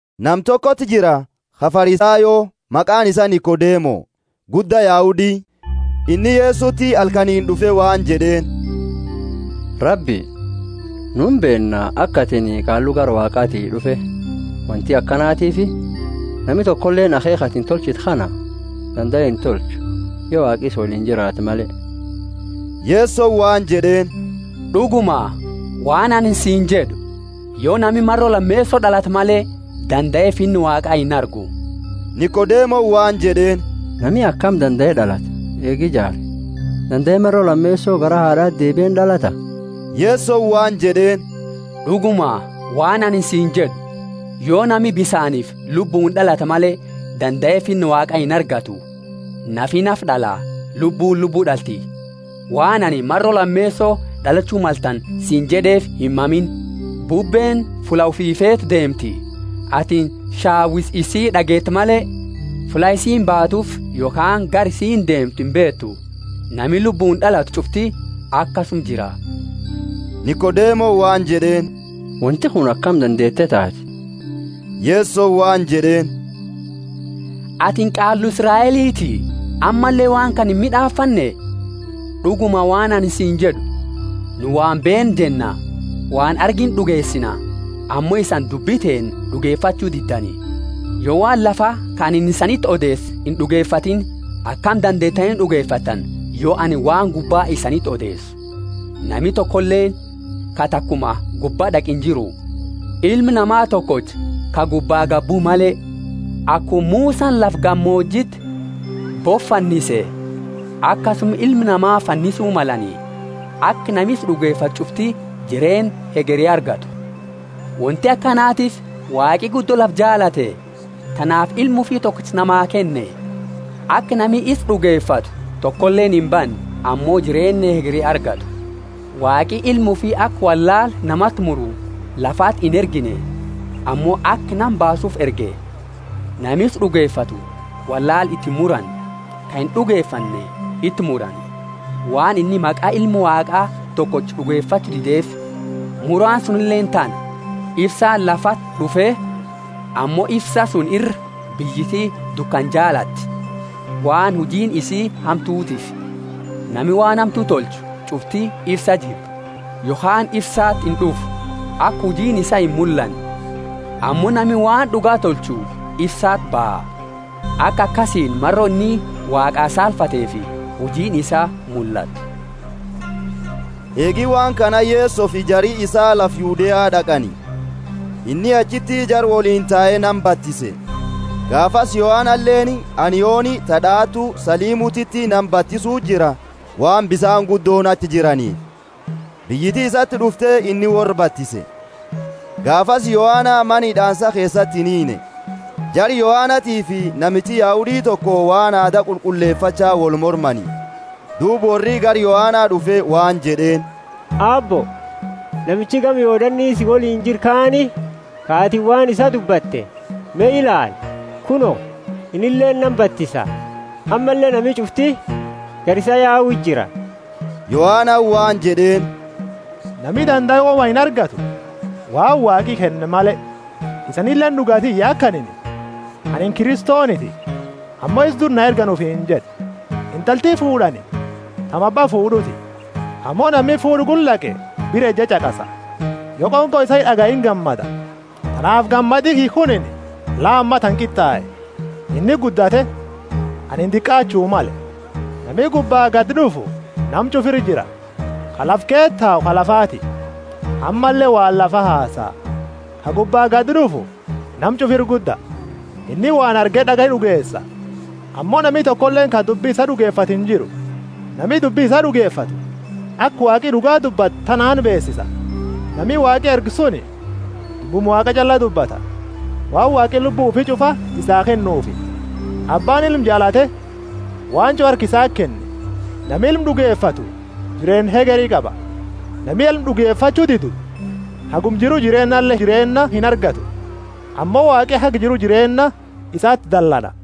Nama tokoti jira, ka Farisayo, maqaani isaa Nikodemo, gudda Yahudi. Inni Yesoti halkaniini d'ufe waan jed'eeni, Rabbi, nu imbeenna aka atini qaallu gara Waaqati d'ufe; wonti akanatiifi nami tokoleeni akheekha atini tolchitu kana dandae intolchu, yo Waaqi isa woliini jiraate male. Yesoni waan jed'eeni, D'uguma, waan anini siini jed'u, Yo nami maro lameeso d'alate male, dandae Finna Waaqa inargu. Nikodemoni waan jed'eeni, Nami akami dandae d'alata, eegi jaare? Dandae maro lameeso garaa haad'ati deebie ind'alata? Yesoni waan jed'eeni, D'uguma, waan anini siini jed'u, Yo nami bisaanifi Lubbuuni d'alate male, dandae Finna Waaqa inargatu. Nafi nafa d'ala, Lubbuuni lubbu d'alti. Waan anini, Maro lameeso d'alachu maltani siini jed'eefi himmamiini. Bubbeeni fulla ufi feetu deemti; atini shawisa isii d'ageeta male, fulla isiini baatuufi yokhaani gara isiini deemtu imbeetu. Nami Lubbuuni d'alatu ch'ufti akasuma jira. Nikodemoni waan jed'eeni, Wonti kuni akami dandeete taati? Yesoni waan jed'eeni, Atini qaallu Israeliti, ammalle waan kana imid'aafanne? D'uguma, waan anini siini jed'u, Nu waan beennu jenna, waan argine d'ugeesina, ammo isani dubbi teenna d'ugefachu diddani. Yo waan lafa, ka anini isaniti odeese ind'ugefatiini, akami dandeetani d'ugefattani, yo anini waan gubba isaniti odeesu? Nami tokoleeni ka takuma gubba d'aqe injiru, Ilma Nama tokocha, ka gubba gadi bue male. Akuma Musani lafa gamoojiti bofa fannise, akasuma Ilma Nama fannisu malani, aka nami isa d'ugefatu ch'ufti jireenna hegeri argatu. Wonti akanatiifi Waaqi guddo lafa jaalate, tanaafi Ilma ufi tokocha namaa kenne, aka nami isa d'ugefatu tokoleeni imbanne, ammo jireenna hegeri argatu. Waaqi Ilma ufi aka wollaala namati muru lafati inergine, ammo aka nama baasuufi erge. Nama isa d'ugefatu wollaala iti imurani; ka ind'ugefanne iti murani, waan inni maqa Ilma Waaqa tokocha d'ugefachu dideefi. Muraani sunileeni tana; ifsaani lafati d'ufe, ammo ifsaa suni ira, biyyiti dukana jaalati, waan hujiini isa hamtutiifi. Nami waan hamtu tolchu ch'ufti ifsa jibba, yokhaani ifsati ind'ufu, aka hujiini isaa imullanne. Ammo nami waan d'uga tolchu ifsati baha, aka akasiini maro inni Waaqa saalfateefi hujiini isaa mullatu. Eegi waan kana Yesofi jari isaa lafa Yudea d'aqani. Inni achiti jara woliini tae nama batise. Gaafasi Yohanaleeni Anioni ta d'aatu Salimutiti nama batisu jira waan bisaani guddooni achi jiraniifi. Biyyiti isati d'ufte inni worra batise. Gaafasi Yohana Mana hid'aansa keesati inhiinne. Jara Yohanatiifi namichi Yahudi toko waan aada qulqullefacha wolmormani. Duuba worri gara Yohana d'ufe waan jed'eeni, Aabbo, namichi gama Yordani si woliini jiru kaani, ka atini waan isaa dubbate, me ilaali, kuno, innileeni nama batisa ammalle nami ch'ufti gara isaa yau jira. Yohanani waan jed'eeni, Nami dandae woma inargatu, waan Waaqi kenne male. Isanileeni d'uga tiyya aka anini, Anini Kristoniti, ammo isa dura na ergani ufiini jed'e. Intalti fuud'ani tami abba fuud'uuti; ammo nami fuud'a gula d'aqe bira eje ch'aqasa, yo qonqo isaa d'agaye ingammada. Tanaafi gammadi kiyya kunini la ammatana qit'ae. Inni guddate, anini diqaachu male. Nami gubba gadi d'ufu nama ch'ufa ira jira; ka lafa keesa tau ka lafaati, ammalle waan lafa hasaa. Ka gubba gadi d'ufu nama ch'ufa ira gudda. Inni waan arge d'agaye d'ugeesa, ammo nami tokoleeni ka dubbi isaa d'ugefatu injiru. Nami dubbi isaa d'ugefatu, aka Waaqi d'uga dubbatu tanaani beesisa. Nami Waaqi erge suni dubbuma Waaqa ch'alla dubbata, waan Waaqi Lubbu ufi ch'ufa isaa kennuufi. Abbaani Ilma jaalate waan ch'ufa harka isati kenne. Nami Ilma d'ugefatu jireenna hegeri qaba; nami Ilma d'ugefachu didu haguma jiru jireennale jireenna inargatu, ammo Waaqi haga jiru jireenna isati dallana.